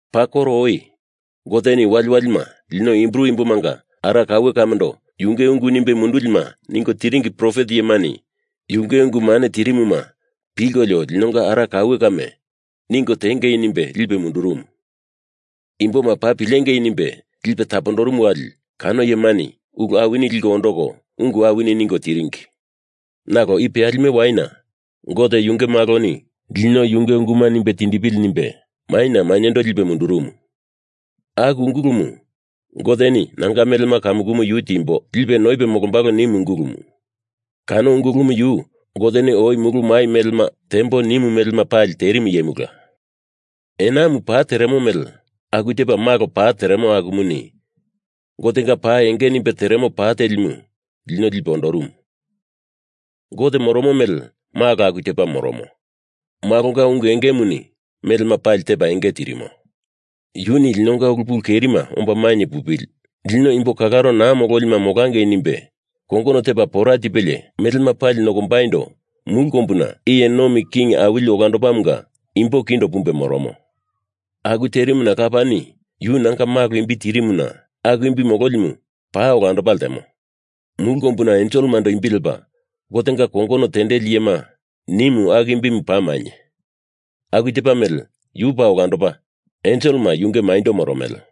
Paa koro oi Goteni waliwalima lino Hibru imbomanga ara kaue kamendo yunge ungu nimbe mundulima ningo tiringi profet iyemani yunge ungu mane tirimuma pilkolio linonga ara kaue kame ningo tiengei nimbe lipe mundurumu. Imboma paa pilengei nimbe lipe tapondorumu wali kano iyemani ulu awini liko ondoko ungu awini ningo tiringi. Nalo i peyalime waina Gote Yunge Maloni lino yunge unguma nimbe tindipili nimbe maina mainyendo lipe mundurumu. Aku Ungulumu Goteni nanga melema kamukumu yu timbo, lipe noipe molombalo nimu ungulumu. Kano Ungulumu yu Goteni oi mulu mai melema tembo nimu melema pali terimu iyemula. Enamu pa teremo mele aku tepa Malo pa teremo akumuni Gotenga pa enge nimbe teremo pa telimu lino lipe ondorumu. Gote moromo mele Malo aku tepa moromo. Malonga ungu engemuni melema pali tepa enge tirimo. Yuni linonga ulu pulu kerima omba mainye pupili, lino imbo kalaro naa mololima molangei nimbe kongono tepa pora tipelie melema pali nokombaindo mulu kombuna Iye Nomi King Awili Olandopamunga imbo kindo pumbe moromo. Aku terimuna Lapani yu nanga Malo imbi tirimuna aku imbi mololimu paa olandopa ltemo, mulu kombuna enselemando imbi lepa Gotenga kongono tendeli iyema nimu aku imbimu paa mainye, aku tepa mele yu paa olandopa enselema yunge maindo moromele.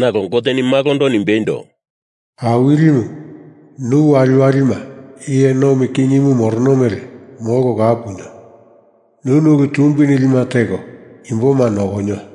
Nalo Goteni Malondo nimbeindo: Awilimu, nu waliwalima iye nomi kingimu morono mele molko kau punio. Nuni ulu tumbi nilima teko imboma nokonio.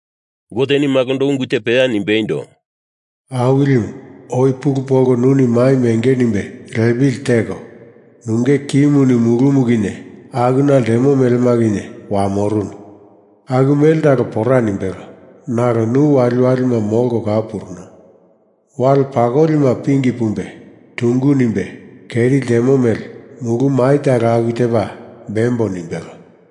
Goteni Malondo ungu te peya nimbeindo, Awilimu, oi pulu polko nuni maimu enge nimbe lepili teko, nunge kimuni mulumu kinye akuna ltemo melema kinye wamorunu. Aku mele talo pora nimbelo, nalo nu waliwalima molko kau puruno. Wali pakolima pingi pumbe tungu nimbe keri ltemo mele mulu mai talo aku tepa bembo nimbelo.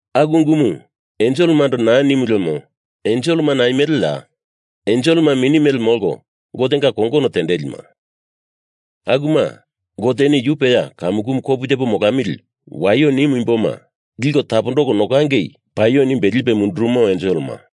Aku ungumu enselemando naa nimu lemo enselema naimeleya? Enselema mini mele molko Gotenga kongono tendelima. Akuma Goteni yu peya kamukumu kopu tepo molamili waio nimu imboma liko tapondoko nokangei paio nimbe lipe mundurumo enselema.